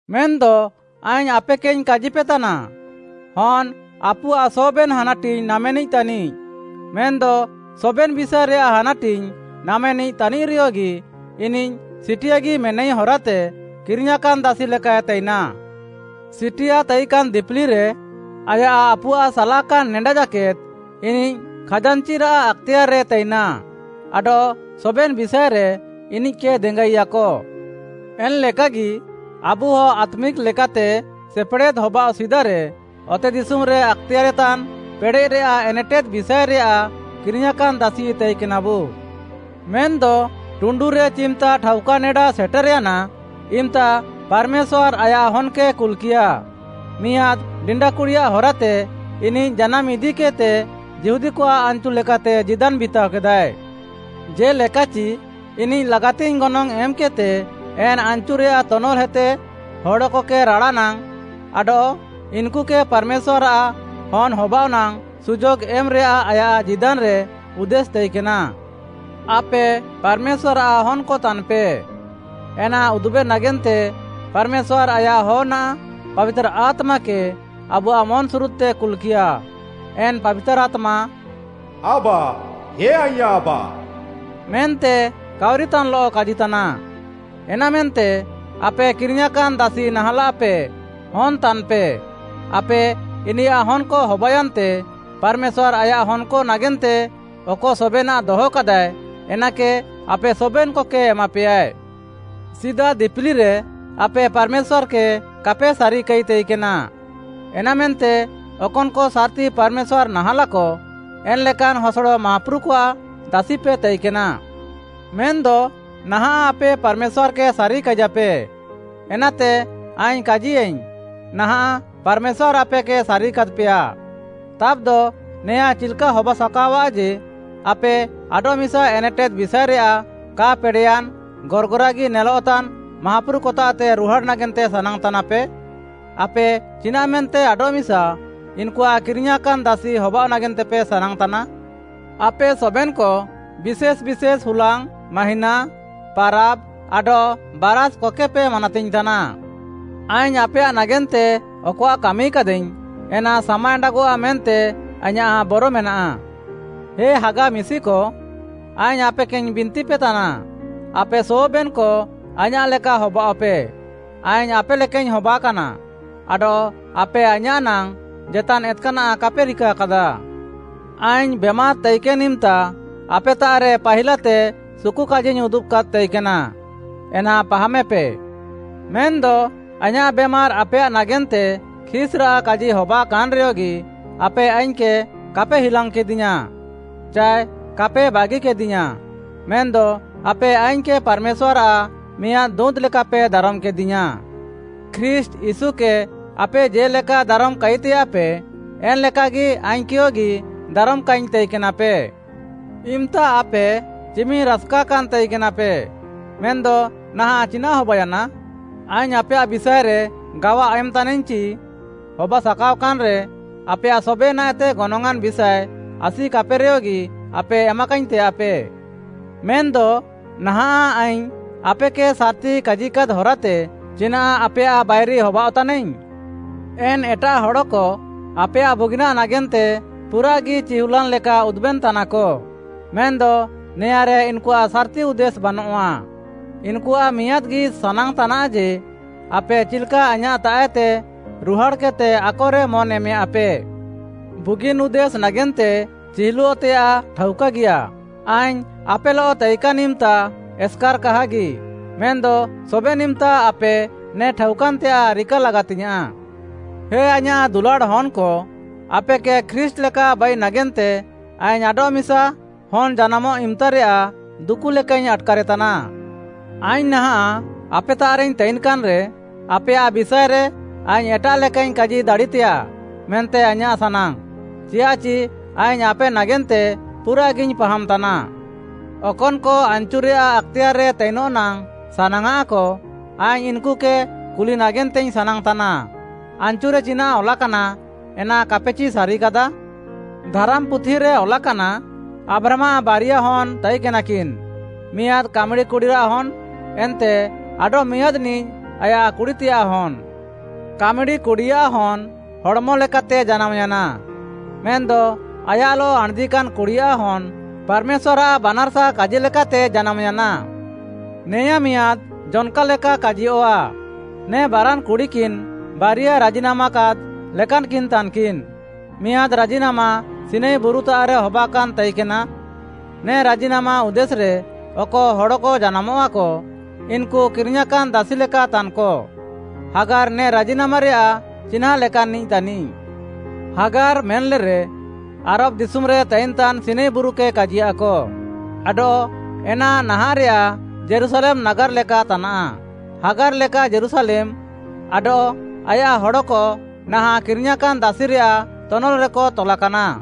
ମେନ୍‌ଦ ଆଇଙ୍ଗ୍‌ ଆପେକେଇଙ୍ଗ୍‌ କାଜିପେତାନା, ହନ୍‌ ଆପୁଆଃ ସବେନ୍‌ ହାନାଟିଙ୍ଗ୍‌ ନାମେନିଃ ତାନିଃ, ମେନ୍‌ଦ ସବେନ୍‌ ବିଷାଏରେୟାଃ ହାନାଟିଙ୍ଗ୍‌ ନାମେନିଃ ତାନିଃରେୟଗି, ଇନିଃ ସିଟିଆଗି ମେନାଇ ହରାତେ, କିରିଙ୍ଗ୍‌ୟାଁକାନ୍‌ ଦାସି ଲେକାଏ ତାଇନା। ସିଟିଆ ତାଇକାନ୍‌ ଦିପିଲିରେ, ଆୟାଃ ଆପୁଆଃ ସାଲାକାନ୍‌ ନେଡା ଜାକେଦ୍‌ ଇନିଃ ଖାଜାନ୍‌ଚିରାଃ ଆକ୍‌ତେୟାର୍‌ରେ ତାଇନାଃ ଆଡଃ ସବେନ୍‌ ବିଷାଏରେ ଇନିଃକେ ଦେଙ୍ଗାଇୟାକ। ଏନ୍‌ଲେକାଗି ଆବୁହ ଆତ୍ମିକ୍‌ ଲେକାତେ ସେପେଡ଼େଦ୍‌ ହବାଅଃ ସିଦାରେ, ଅତେଦିଶୁମ୍‌ରେ ଆକ୍‌ତେୟାରେତାନ୍‌ ପେଡ଼େଃରେୟାଃ ଏନେଟେଦ୍‌ ବିଷାଏରେୟାଃ କିରିଙ୍ଗ୍‌ୟାଁକାନ୍‌ ଦାସି ତାଇକେନାବୁ। ମେନ୍‌ଦ ଟୁଣ୍ଡୁରେ ଚିମ୍‌ତା ଠାଉକା ନେଡା ସେଟେର୍‌ୟାନା ଇମ୍‌ତା ପାର୍‌ମେଶ୍ୱାର୍‌ ଆୟାଃ ହନ୍‌କେ କୁଲ୍‌କିୟା, ମିଆଁଦ୍‌ ଡିଣ୍ଡା କୁଡ଼ିଆଃ ହରାତେ ଇନିଃ ଜାନାମ୍‌ ଇଦିକେଦ୍‌ତେ ଯିହୁଦୀକଆଃ ଆନ୍‌ଚୁ ଲେକାତେ ଜୀଦାନ୍‌ ବିତାଅକେଦାଏ। ଜେ'ଲେକାଚି ଇନିଃ ଲାଗାତିଙ୍ଗ୍‌ ଗନଙ୍ଗ୍‌ ଏମ୍‌କେଦ୍‌ତେ ଏନ୍‌ ଆନ୍‌ଚୁରେୟାଃ ତନଲ୍‌ହେତେ ହଡ଼କକେ ରାଡ଼ାନାଙ୍ଗ୍‌ ଆଡଃ ଇନ୍‌କୁକେ ପାର୍‌ମେଶ୍ୱାର୍‌ଆଃ ହନ୍‌ ହବାଅଃନାଙ୍ଗ୍‌ ସୁଯୋଗ୍‌ ଏମ୍‌ରେୟାଃ ଆୟାଃ ଜୀଦାନ୍‌ରେ ଉଦ୍ଦେଶ୍‌ ତାଇକେନା। ଆପେ ପାର୍‌ମେଶ୍ୱାର୍‌ଆଃ ହନ୍‌କ ତାନ୍‌ପେ, ଏନା ଉଦୁବେ ନାଗେନ୍ତେ ପାର୍‌ମେଶ୍ୱାର୍‌ ଆୟାଃ ହନ୍‌ଆଃ ପାବିତାର୍‌ ଆତ୍ମାକେ ଆବୁଆଃ ମନ୍‌ସୁରୁଦ୍‌ତେ କୁଲ୍‌କିୟା, ଏନ୍‌ ପାବିତାର୍‌ ଆତ୍ମା “ଆବା! ହେ ଆଇଁୟାଃ ଆବା।” ମେନ୍ତେ କାଉରିତାନ୍‌ଲଃ କାଜିତାନା। ଏନାମେନ୍ତେ ଆପେ କିରିଙ୍ଗ୍‌ୟାଁକାନ୍‌ ଦାସି ନାହାଁଲାଃପେ, ହନ୍‌ ତାନ୍‌ପେ। ଆପେ ଇନିୟାଃ ହନ୍‌କ ହବାୟାନ୍ତେ, ପାର୍‌ମେଶ୍ୱାର୍‌ ଆୟାଃ ହନ୍‌କ ନାଗେନ୍ତେ ଅକ ସବେନାଃ ଦହକାଦାଏ, ଏନାକେ ଆପେ ସବେନ୍‌କକେ ଏମାପେୟା। ସିଦା ଦିପିଲିରେ ଆପେ ପାର୍‌ମେଶ୍ୱାର୍‌କେ କାପେ ସାରିକାଇ ତାଇକେନା, ଏନାମେନ୍ତେ ଅକନ୍‌କ ସାର୍‌ତି ପାର୍‌ମେଶ୍ୱାର୍‌ ନାହାଁଲାକ, ଏନ୍‌ଲେକାନ୍‌ ହସଡ଼ ମାହାପୁରୁକଆଃ ଦାସିପେ ତାଇକେନା। ମେନ୍‌ଦ ନାହାଁଃ ଆପେ ପାର୍‌ମେଶ୍ୱାର୍‌କେ ସାରିକାଇଜାଃପେ, ଏନାତେ ଆଇଙ୍ଗ୍‌ କାଜିୟାଇଙ୍ଗ୍‌, ନାହାଁଃ ପାର୍‌ମେଶ୍ୱାର୍‌ ଆପେକେ ସାରିକାଦ୍‌ପେୟା। ତାବ୍‌ଦ ନେଆଁ ଚିଲ୍‌କା ହବାସାକାଅଆଃ ଯେ, ଆପେ ଆଡଃମିସା ଏନେଟେଦ୍‌ ବିଷାଏରେୟାଃ କା ପେଡ଼େୟାନ୍‌, ଗର୍‌ଗରାଗି ନେଲଃତାନ୍‌ ମାହାପୁରୁକତାଃତେ ରୁହାଡ଼୍‌ ନାଗେନ୍ତେ ସାନାଙ୍ଗ୍‌ତାନାପେ? ଆପେ ଚିନାଃମେନ୍ତେ ଆଡଃମିସା ଇନ୍‌କୁଆଃ କିରିଙ୍ଗ୍‌ୟାଁକାନ୍‌ ଦାସି ହବାଅଃ ନାଗେନ୍ତେପେ ସାନାଙ୍ଗ୍‌ତାନା? ଆପେ ସବେନ୍‌କ ବିଶେଷ୍‌ ବିଶେଷ୍‌ ହୁଲାଙ୍ଗ୍‌, ମାହିଁନା, ପାରାବ୍‌, ଆଡଃ ବାରାଷ୍‌କକେପେ ମାନାତିଙ୍ଗ୍‌ତାନା। ଆଇଙ୍ଗ୍‌ ଆପେୟାଃ ନାଗେନ୍ତେ ଅକଆଃ କାମିକାଦାଇଙ୍ଗ୍‌, ଏନା ସାମା ଏଣ୍ଡାଗଃଆ ମେନ୍ତେ ଆଇଁୟାଃ ବର ମେନାଃ। ହେ ହାଗା ମିଶିକ, ଆଇଙ୍ଗ୍‌ ଆପେକେଇଙ୍ଗ୍‌ ବିନ୍ତିପେତାନା, ଆପେ ସବେନ୍‌କ ଆଇଁୟାଃ ଲେକା ହବାଅଃପେ। ଆଇଙ୍ଗ୍‌ ଆପେ ଲେକାଇଙ୍ଗ୍‌ ହବାକାନା ଆଡଃ ଆପେ ଆଇଁୟାଃ ନାଙ୍ଗ୍‌ ଜେତାନ୍‌ ଏତ୍‌କାନାଃ କାପେ ରିକାକାଦା। ଆଇଙ୍ଗ୍‌ ବେମାର୍‌ ତାଇକେନ୍‌ ଇମ୍‌ତା ଆପେତାଃରେ ପାହିଲାତେ ସୁକୁକାଜିଇଙ୍ଗ୍‌ ଉଦୁବାକାଦ୍‌ ତାଇକେନା, ଏନା ପାହାମେପେ। ମେନ୍‌ଦ ଆଇଁୟାଃ ବେମାର୍‌ ଆପେୟାଃ ନାଗେନ୍ତେ ଖିସ୍‌ରାଃ କାଜି ହବାକାନ୍‌ରେୟଗି, ଆପେ ଆଇଙ୍ଗ୍‌କେ କାପେ ହିଲାଙ୍ଗ୍‌କେଦିୟାଁ ଚାଏ କାପେ ବାଗିକେଦିୟାଁ। ମେନ୍‌ଦ ଆପେ ଆଇଙ୍ଗ୍‌କେ ପାର୍‌ମେଶ୍ୱାର୍‌ଆଃ ମିଆଁଦ୍‌ ଦୁଁତ୍‌ ଲେକାପେ ଦାରମ୍‌କେଦିୟାଁ। ଖ୍ରୀଷ୍ଟ୍‌ ୟୀଶୁକେ ଆପେ ଜେ'ଲେକା ଦାରମ୍‌ କାଇତେୟାଃପେ, ଏନ୍‌ଲେକାଗି ଆଇଙ୍ଗ୍‌କେୟଗି ଦାରମ୍‌କାଇଙ୍ଗ୍‌ ତାଇକେନାପେ। ଇମ୍‌ତା ଆପେ ଚିମିନ୍‌ ରାସ୍‌କାକାନ୍‌ ତାଇକେନାପେ! ମେନ୍‌ଦ ନାହାଁଃ ଚିନାଃ ହବାୟାନା? ଆଇଙ୍ଗ୍‌ ଆପେୟାଃ ବିଷାଏରେ ଗାୱା ଏମ୍‌ତାନାଇଙ୍ଗ୍‌ ଚି, ହବାସାକାଅକାନ୍‌ରେ, ଆପେୟାଃ ସବେନାଃଏତେ ଗନଙ୍ଗ୍‌ଆଁନ୍‌ ବିଷାଏ ଆସିକାପେରେୟଗି, ଆପେ ଏମାକାଇଙ୍ଗ୍‌ ତେୟାଃପେ। ମେନ୍‌ଦ ନାହାଁଃ ଆଇଙ୍ଗ୍‌ ଆପେକେ ସାର୍‌ତି କାଜିକାଦ୍‌ ହରାତେ ଚିନାଃ ଆପେୟାଃ ବାଇରି ହବାଅଃତାନାଇଙ୍ଗ୍‌? ଏନ୍ ଏଟାଃ ହଡ଼କ ଆପେୟାଃ ବୁଗିନାଃ ନାଗେନ୍ତେ ପୁରାଃଗି ଚିହୁଲାନ୍‌ ଲେକା ଉଦୁବେନ୍‌ତାନାକ। ମେନ୍‌ଦ ନେଆଁରେ ଇନ୍‌କୁଆଃ ସାର୍‌ତି ଉଦ୍ଦେଶ୍‌ ବାନଃଆ। ଇନ୍‌କୁଆଃ ମିଆଁଦ୍‌ଗି ସାନାଙ୍ଗ୍‌ତାନାଃ ଯେ, ଆପେ ଚିଲ୍‌କା ଆଇଁୟାଃତାଃଏତେ ରୁହାଡ଼୍‌କେଦ୍‌ତେ ଆକରେ ମନ୍‌ ଏମେୟାଁଃପେ। ବୁଗିନ୍‌ ଉଦ୍ଦେଶ୍‌ ନାଗେନ୍ତେ ଚିହୁଲଃତେୟାଃ ଠାଉକାଗିୟା। ଆଇଙ୍ଗ୍‌ ଆପେଲଃ ତାଇକାନ୍‌ ଇମ୍‌ତା ଏସ୍‌କାର୍‌ କାହାଗି, ମେନ୍‌ଦ ସବେନ୍‌ ଇମ୍‌ତା ଆପେ ନେ ଠାଉକାନ୍‌ତେୟାଃ ରିକା ଲାଗାତିଙ୍ଗ୍‌ୟାଁଃ। ଏ ଆଇଁୟାଃ ଦୁଲାଡ଼୍‌ ହନ୍‌କ, ଆପେକେ ଖ୍ରୀଷ୍ଟ୍‌ ଲେକା ବାଇ ନାଗେନ୍ତେ ଆଇଙ୍ଗ୍‌ ଆଡଃମିସା ହନ୍‌ ଜାନାମଃ ଇମ୍‌ତାରେୟାଃ ଦୁକୁ ଲେକାଇଙ୍ଗ୍‌ ଆଟ୍‌କାରେତାନା। ଆଇଙ୍ଗ୍‌ ନାହାଁଃ ଆପେତାଃରେଇଙ୍ଗ୍‌ ତାଇନ୍‌କାନ୍‌ରେ, ଆପେୟାଃ ବିଷାଏରେ ଆଇଙ୍ଗ୍‌ ଏଟାଃ ଲେକାଇଙ୍ଗ୍‌ କାଜି ଦାଡ଼ିତେୟାଃ ମେନ୍ତେ ଆଇଁୟାଃ ସାନାଙ୍ଗ୍‌। ଚିୟାଃଚି ଆଇଙ୍ଗ୍‌ ଆପେ ନାଗେନ୍ତେ ପୁରାଃଗିଇଙ୍ଗ୍‌ ପାହାମ୍‌ତାନା। ଅକନ୍‌କ ଆନ୍‌ଚୁରେୟାଃ ଆକ୍‌ତେୟାର୍‌ରେ ତାଇନଃ ନାଙ୍ଗ୍‌ ସାନାଙ୍ଗ୍‌ଆଃକ, ଆଇଙ୍ଗ୍‌ ଇନ୍‌କୁକେ କୁଲି ନାଗେନ୍ତେଇଙ୍ଗ୍‌ ସାନାଙ୍ଗ୍‌ତାନା, ଆନ୍‌ଚୁରେ ଚିନାଃ ଅଲାକାନା, ଏନା କାପେଚି ସାରିକାଦା? ଧାରାମ୍‌ପୁଥିରେ ଅଲାକାନା, ଆବ୍ରାହାମ୍‌ଆଃ ବାରିୟା ହନ୍‌ ତାଇକେନାକିନ୍‌, ମିଆଁଦ୍ କାମ୍‌ଡ଼ି କୁଡ଼ିରାଃ ହନ୍‌ ଏନ୍ତେ ଆଡଃମିଆଁଦ୍‌ନିଃ ଆୟାଃ କୁଡ଼ିତେୟାଃ ହନ୍‌। କାମ୍‌ଡ଼ି କୁଡ଼ିଆଃ ହନ୍‌, ହଡ଼୍‌ମଲେକାତେ ଜାନାମ୍‌ୟାନା, ମେନ୍‌ଦ ଆୟାଃଲଃ ଆଣ୍‌ଦିକାନ୍‌ କୁଡ଼ିଆଃ ହନ୍‌, ପାର୍‌ମେଶ୍ୱାର୍‌ଆଃ ବାନାର୍‌ସା କାଜି ଲେକାତେ ଜାନାମ୍‌ୟାନା। ନେଆଁ ମିଆଁଦ୍‌ ଜନ୍‌କା ଲେକା କାଜିୟଃଆ। ନେ ବାରାନ୍‌ କୁଡ଼ିକିନ୍‌ ବାରିୟା ରାଜିନାମାକାଦ୍‌ ଲେକାନ୍‌କିନ୍‌ ତାନ୍‌କିନ୍‌। ମିଆଁଦ୍‌ ରାଜିନାମା ସିନାଇ ବୁରୁତାଃରେ ହବାକାନ୍‌ ତାଇକେନା। ନେ ରାଜିନାମା ଉଦ୍ଦେଶ୍‌ରେ ଅକ ହଡ଼କ ଜାନାମଃଆକ, ଇନ୍‌କୁ କିରିଙ୍ଗ୍‌ୟାଁକାନ୍‌ ଦାସି ଲେକା ତାନ୍‌କ। ହାଗାର୍‌ ନେ ରାଜିନାମାରେୟାଃ ଚିହ୍ନାଁଁ ଲେକାନ୍‌ନିଃ ତାନିଃ। ହାଗାର୍‌ ମେନ୍‌ଲେରେ ଆରବ୍‌ ଦିଶୁମ୍‌ରେ ତାଇନ୍‌ତାନ୍‌ ସିନାଇ ବୁରୁକେ କାଜିୟାଃକ, ଆଡଃ ଏନା ନାହାଁଃରେୟାଃ ଯୀରୁଶାଲେମ୍‌ ନାଗାର୍‌ ଲେକା ତାନା। ହାଗାର୍‌ ଲେକା ଯୀରୁଶାଲେମ୍‌ ଆଡଃ ଆୟାଃ ହଡ଼କ ନାହାଁଃ କିରିଙ୍ଗ୍‌ୟାଁକାନ୍‌ ଦାସିରେୟାଃ ତନଲ୍‌ରେକ ତଲାକାନା।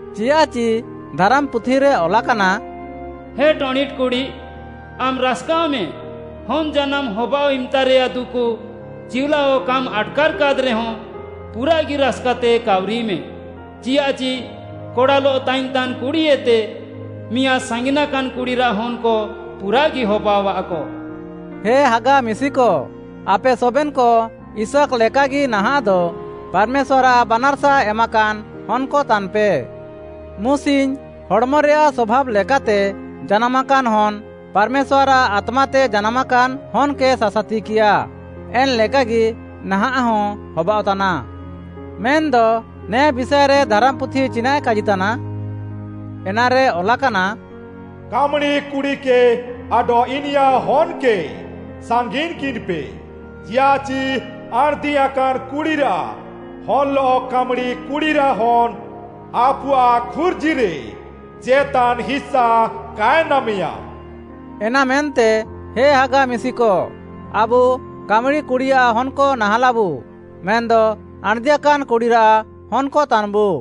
ଚିୟାଃଚି ଧାରାମ୍‌ପୁଥିରେ ଅଲାକାନା, “ହେ ଟଣିଟ୍‌ କୁଡ଼ି, ଆମ୍‌ ରାସ୍‌କାଅଃମେ, ହନ୍‌ ଜାନାମ୍‌ ହବାଅଃ ଇମ୍‌ତାରେୟାଃ ଦୁକୁ ଚିଉଲାଅ କାମ୍‌ ଆଟ୍‌କାର୍‌କାଦ୍‌ରେହଁ, ପୁରାଃଗି ରାସ୍‌କାତେ କାଉରିମେ। ଚିୟାଃଚି କଡ଼ାଲଃ ତାଇନ୍‌ତାନ୍ କୁଡ଼ିଏତେ ମିଆଁଦ୍ ସାଙ୍ଗିନାକାନ୍‌ କୁଡ଼ିରାଃ ହନ୍‌କ ପୁରାଃଗି ହବାଅଃଆକ।” ହେ ହାଗା ମିଶିକ, ଆପେ ସବେନ୍‌କ ଇସାକ୍‌ ଲେକାଗି ନାହାଃଁଦ ପାର୍‌ମେଶ୍ୱାର୍‌ଆଃ ବାନାର୍‌ସା ଏମାକାନ୍‌ ହନ୍‌କ ତାନ୍‌ପେ। ମୁସିଙ୍ଗ୍‌ ହଡ଼୍‌ମରେୟାଃ ସଭାବ୍‌ ଲେକାତେ ଜାନାମାକାନ୍‌ ହନ୍‌, ପାର୍‌ମେଶ୍ୱାର୍‌ଆଃ ଆତ୍ମାତେ ଜାନାମାକାନ୍‌ ହନ୍‌କେ ସାସାତିକିୟାଏ। ଏନ୍‌ଲେକାଗି ନାହାଁଃହଁ ହବାଅଃତାନା। ମେନ୍‌ଦ ନେ ବିଷାଏରେ ଧାରାମ୍‌ପୁଥି ଚିନାଃଏ କାଜିତାନା? ଏନାରେ ଅଲାକାନା, “କାମ୍‌ଡ଼ି କୁଡ଼ିକେ ଆଡଃ ଇନିୟାଃ ହନ୍‌କେ ସାଙ୍ଗିନ୍‌କିନ୍‌ପେ, ଚିୟାଃଚି ଆଣ୍‌ଦିୟାକାନ୍‌ କୁଡ଼ିରାଃ ହନ୍‌ଲଃ କାମ୍‌ଡ଼ି କୁଡ଼ିରାଃ ହନ୍‌ ଆପୁଆଃ ଖୁର୍ଜିରେ ଜେତାନ୍‌ ହିସା କାଏ ନାମେୟା।” ଏନାମେନ୍ତେ ହେ ହାଗା ମିଶିକ, ଆବୁ କାମ୍‌ଡ଼ି କୁଡ଼ିଆଃ ହନ୍‌କ ନାହାଁଲାବୁ, ମେନ୍‌ଦ ଆଣ୍‌ଦିୟାକାନ୍‌ କୁଡ଼ିରାଃ ହନ୍‌କ ତାନ୍‌ବୁ।